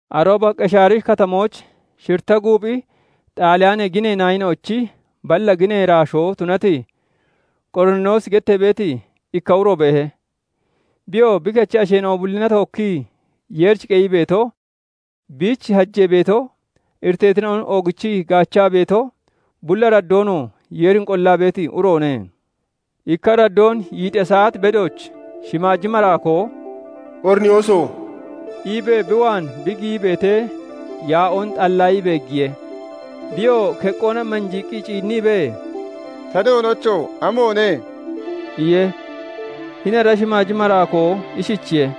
Arooba Qeshaari Katamooch shiritta guuphi Xaaliyaanee ginee naayina'ochi balla ginee iraashoo tunati, Qoriniyoosi gettee beeti ikka uro beehe. Biyoo bi kechi asheena'o bullina tookkii Yeerich qeyii beeto, biich hajee beeto, iriteetina'on oogichii gaachaa beeto, bulli araddoonoo Yeerin qollaa beeti uroone. Ikka araddoon yiixiya saat bedooch shimaaji maraakoo "Qoriniyooso!" iibee bi waan bi giyii beetee, yaa'oon xallaayii beeggiye. Biyoo keqqoona manjiiqqi ciinniibee, "Ta Doonocho! Amoone?" iye. Hini ara shimaaji maraakoo ishichiye:-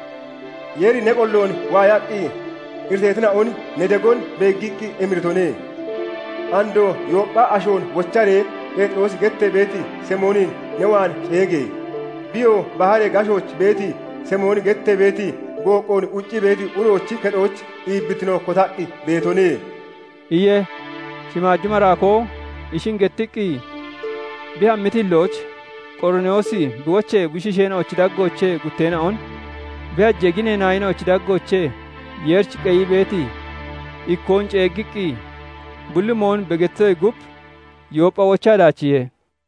"Yeeri ne qolloon waayaqqi, iriteetina'on ne degon beeggiqqi emiritone. Andoo Yooppha ashoon wocharee, Pheexiroosi gettee beeti Simoonin ne waan ceege! Biyoo baharee gashooch beeti, Simooni gettee beeti, gooqqoon quccii beeti uroochi kexooch iibbittino kotaqqi beetone" iye. Shimaaji maraakoo ishin gettiqqi bi hammiti hillooch, Qoriniyoosi bi wochee bushiisheena'ochi daggoochee gutteena'on, bi hajee ginee naayina'ochi daggoochee Yeerich qeyii beeti ikkoon ceeggiqqi, bulli mooyon bi gettitoyee gub, Yooppha wochaa daachiihe.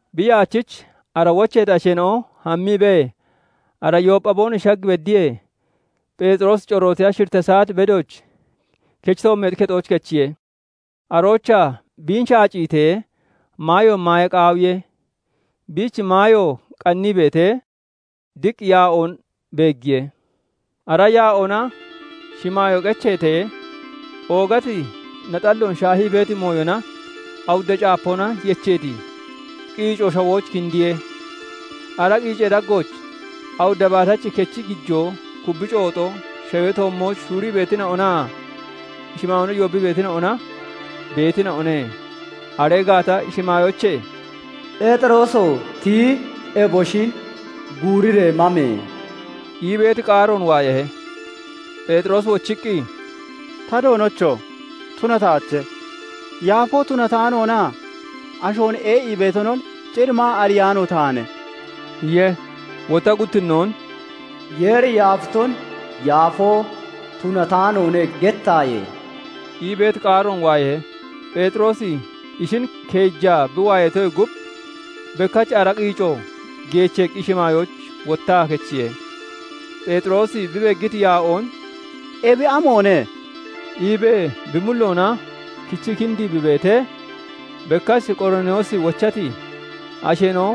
Bi yaachich ara wocheeti asheena'o hammiibee, ara Yooppha boonoshi shag beddiyee, Pheexiroosi corootiya shiritta saat bedooch kechi toommeexi kexooch kechiye. Aroochaa biin shaaciitee, maayoon maaya qaawiye. Biich maayo qannii beetee, diq yaa'oon beeggiye; ara yaa'oona shimaayoo qecheetee, oogati naxalloon shaahii beeti mooyona awudda caapoona yecheeti qiico shawooch kindiye. Ara qiicee daggooch awudda baatachi kechi gijoo, kubbi cooxo, shawee toommooch shuurii beetina'onaa shimaayoona yoobbii beetina'ona beetina'one. Aree gaata shimaayoochee "Pheexirooso! Tiyi eboshin guuriree mame!" ii beeti qaaroon waayahe. Pheexiroosi wochiqqi, "Ta Doonocho! Tunataache! Yaafoo tunataanoonaa ashoon ee'ii beetonon cir maa ariyaano taane" iye. Wotta guttinnoon "Yeeri yaafiton 'Yaafoo tunataanoone' gettaaye!" ii beeti qaaroon waayahe. Pheexiroosi ishin keejaa bi waayatoyee gub, bekkach ara qiico geecheeqqi shimaayooch wottaa kechiye. Pheexiroosi bi beeggiti yaa'oon "Ebi amoone?" iibee bi mulloona kichii kindii bi beetee, bekkach Qoriniyoosi wochati asheena'o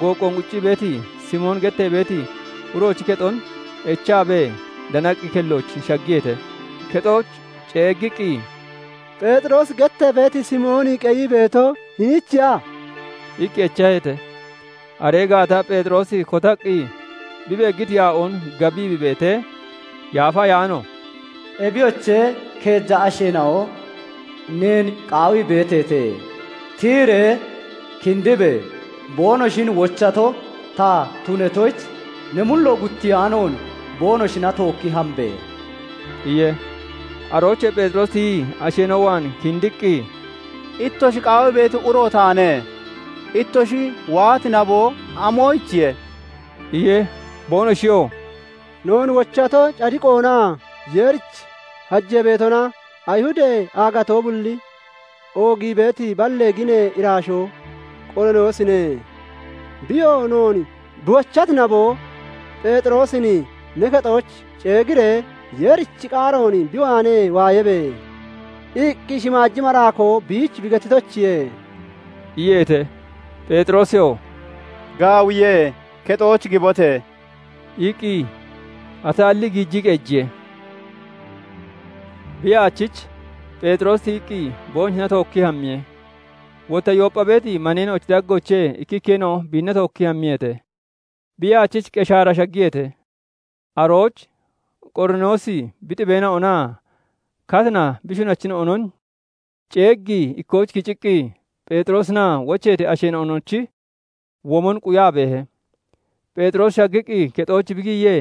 gooqqoon quccii beeti, Simooni gettee beeti uroochi kexon echaabee danaqqi kellooch shaggiyeete; kexooch ceeggiqqi, "Pheexiroosi gettee beeti Simooni qeyii beeto, hiniichiya?" iqqi echaheete. Aree gaata Pheexiroosi kotaqqi bi beeggiti yaa'oon gabii bi beetee, Yaafa Ayaano "Ebiyoche, keeja asheena'o neen qaawii beeteete. Tiyiree kindibe! Boonoshin wochato ta tunatoyich, ne mulloon guttiyaanoon boonoshina tookki hambe!" iye. Aroochee Pheexiroosi tiyii asheena'o waan kindiqqi, "Ittoshi qaawii beeti uro taane. Ittoshi waati naboo, amoyichiye?" iye. Boonoshiyoo "Noon wochato cadiqoonaa Yeerich hajee beetona, Ayihudee aagatoo bulli oogii beeti balla ginee iraashoo Qoriniyoosine. Biyoo noon bi wochati naboo, 'Pheexirosin ne kexooch ceeggiiree, Yeerichi qaaroon bi waanee waayabe!' iqqi shimaaji maraakoo biich bi gettitoyichiye" iyeete. Pheexiroosiyoo "Gaawiye; kexooch gibote!" iqqi ataallii giijii qeejiye. Bi yaachich Pheexiroosi tiyiqqi boonoshina tookkii hammiye; wotta Yooppha beeti maneena'ochi daggoochee ikkikkeena'o biinna tookkii hammiyeete. Bi yaachich Qeshaara shaggiyeete. Arooch Qoriniyoosi bi xibeena'onaa katina bi shunachina'onon ceeggii ikkooch kiciqqi, Pheexiroosinaa wocheeti asheena'onochi womon quyaa beehe. Pheexiroosi shaggiqqi kexooch bi giyee,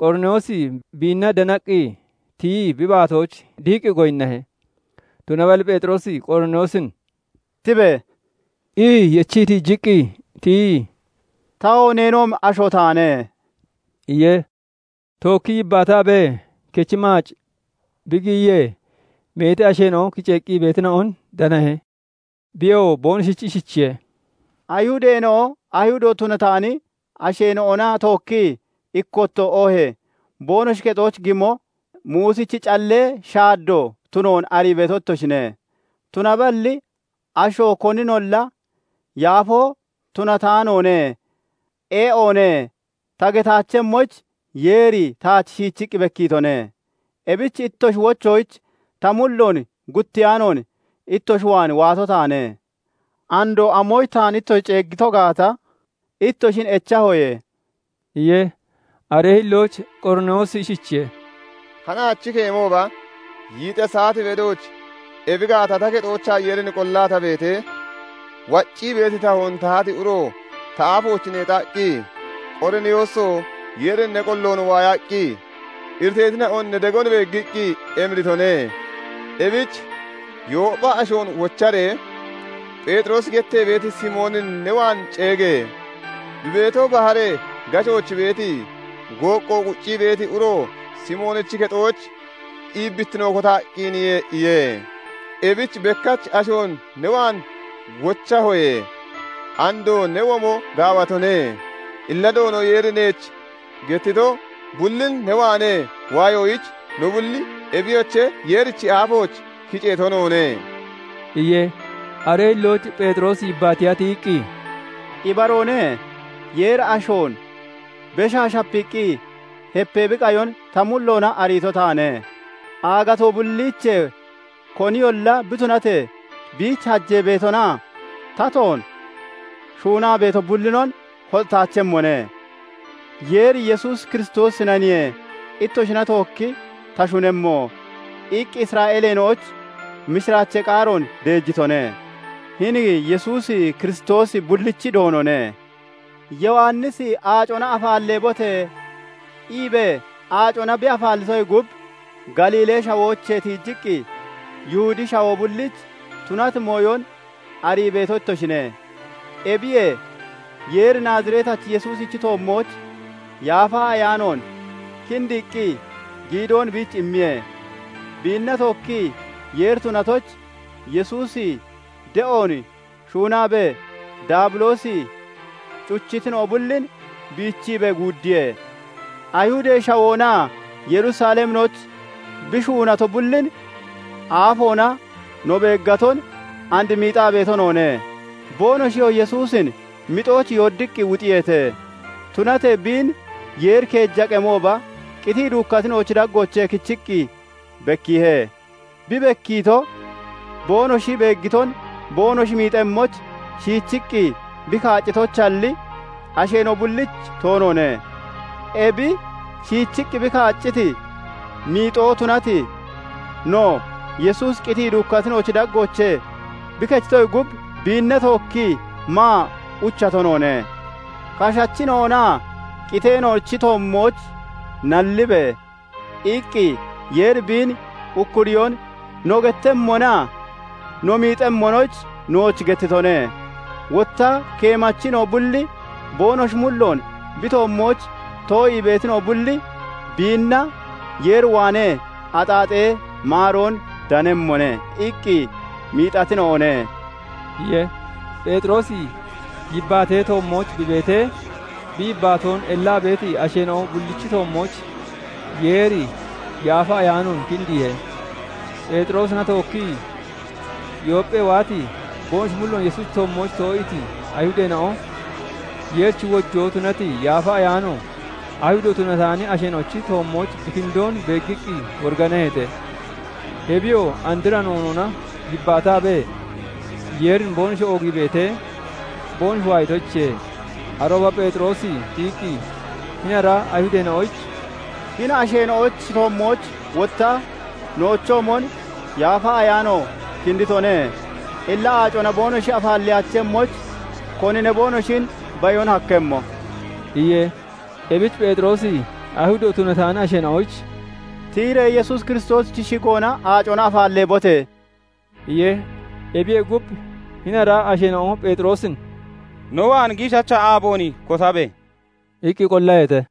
Qoriniyoosi biinna danaqqi tiyii bi baatooch dihiqqi goyinnahe. Tunaballi Pheexiroosi Qoriniyoosin "Tibe!" ii yechii tiijiqqi tiyii, "Tawoo neenoomi asho taane" iye. Tookkii yibbaataabee kechi maac bi giyiyee, meeti asheena'o kiceeqqi beetina'on danahe. Biyoo boonoshich ishichiye:- "Ayihudeena'o Ayihudo tunataani asheena'ona tookkii ikkotto oohee boonoshi kexooch gimo Muusichi callee shaaddoo tunoon arii beeto ittoshine. Tunaballi asho koninolla 'Yaafoo tunataanoone; ee'oone' ta getaachemmoyich Yeeri taach shiichiqqi bekkiitone. Ebich ittoshi wochoyich ta mulloon guttiyaanoon, ittoshi waan waato taane. Andoo amoyich taan ittoshi ceeggiito gaata ittoshin echahoye" iye. Aree hillooch Qoriniyoosi ishichiye:- "Hanaach keemooba yiixiya saat bedooch ebi gaata ta kexoochaa Yeerin qollaa ta beetee, waccii beeti tahoon tahati uro ta aafooch neexaqqi, 'Qoriniyooso! Yeeri ne qolloon waayaqqi, iriteetina'on ne degon beeggiqqi emiritone. Ebich Yooppha ashoon wocharee, Pheexiroosi gettee beeti Simoonin ne waan ceege! Bi beeto, baharee gashooch beeti, gooqqo quccii beeti uro Simoonichi kexooch iibbittino kotaqqiniye' iye. Ebich bekkach ashoon ne waan wochahoye; andoo ne womo gaawatone. Illa Doono Yeeri neech gettito bullin ne waanee waayoyich no bulli ebiyoche, Yeerichi aafooch kiceeto noone" iye. Aree hillooch Pheexiroosi yibbaatiya tiyiqqi, "Ibaroone; Yeeri ashoon beshaa shapiiqqi hepee bi qayon ta mulloona ariito taane; aagatoo bulliichee koniyolla bi tunatee, biich hajee beetonaa tatoon shuunaa beeto bullinon hoxataachemmone. Yeeri 'Yesuus Kiristoosinaniye ittoshina tookki ta shunemmo' iqqi Isra'eeleena'oyich mishiraachee qaaroon deejitone; hini Yesuusi Kiristoosi bullichi Doonone. Yowannisi 'Aacona afaalleebote!' iibee aacona bi afaallitoyee gub, Galiilee Shawoochee tiijiqqi, Yihudee Shawoo bulliich tunati mooyon arii beeto ittoshine. Ebiyee Yeeri Naaziretachi Yesuusichi toommooch Yaafa Ayaanoon kindiiqqi giidoon biich immiye; biinna tookkii Yeeri tunatoyich, Yesuusi de'oon shuunaabee Daabiloosi cuchitina'o bullin biichiibee guuddiye. "Ayihudee Shawoonaa Yerusaleminooch bi shuunato bullin aafoona no beeggaton and miixaa beeto noone. Boonoshiyoo Yesuusin mixooch yooddiqqi wuxiyeete; tunatee biin Yeeri keeja qemooba qitii duukkatina'ochi daggoochee kichiqqi bekkiihe. Bi bekkiito, boonoshi beeggiton boonoshi miixemmoyich shiichiqqi bi kaaccitoyichalli, asheena'o bullich toonoone. Ebi shiichiqqi bi kaacciti miixoo tunati no, Yesuusi qitii duukkatina'ochi daggoochee bi kechitoyee gub, biinna tookkii maa uchato noone. 'Kashachina'onaa qiteena'onochi toommooch nallibe!' iqqi Yeeri biin ukkuriyoon no gettemmonaa no miixemmonoyich nooch gettitone. Wotta keemachina'o bulli 'Boonoshi mulloon bi toommooch too'ii beetina'o bulli biinna Yeer waanee axaaxee maaroon danemmone' iqqi miixatina'one" iye. Pheexiroosi yibbaatee toommooch bi beetee, bi yibbaatoon ellaa beeti asheena'o bullichi toommooch Yeeri Yaafa Ayaanoon kindiihe. Pheexiroosina tookkii Yoopphee waati, boonoshi mulloon Yesuusichi toommooch too'iiti Ayihudeena'o, Yeerichi wojoo tunati Yaafa Ayaano Ayihudo tunataani asheena'ochi toommooch bi kindoon beeggiqqi woriganaheete. Ebiyoo andra noonoona yibbaataabee Yeerin boonoshi oogii beetee, boonoshi waayatoyichiye. Arooba Pheexiroosi tiyiqqi hini ara Ayihudeena'oyich, "Hini asheena'ochi toommooch wotta noochoomon Yaafa Ayaano kinditone; illa aacona boonoshi afaalleyaachemmoyich, konine boonoshin bayon hakkemmo?" iye. Ebich Pheexiroosi Ayihudo tunataani asheena'oyich "Tiyiree Yesuus Kiristoosichi shigoona aacona afaalleebote!" iye. Ebiyee gub, hini ara asheena'o Pheexiroosin "No waan giishacha aaboon kotabe!" iqqi qollaheete.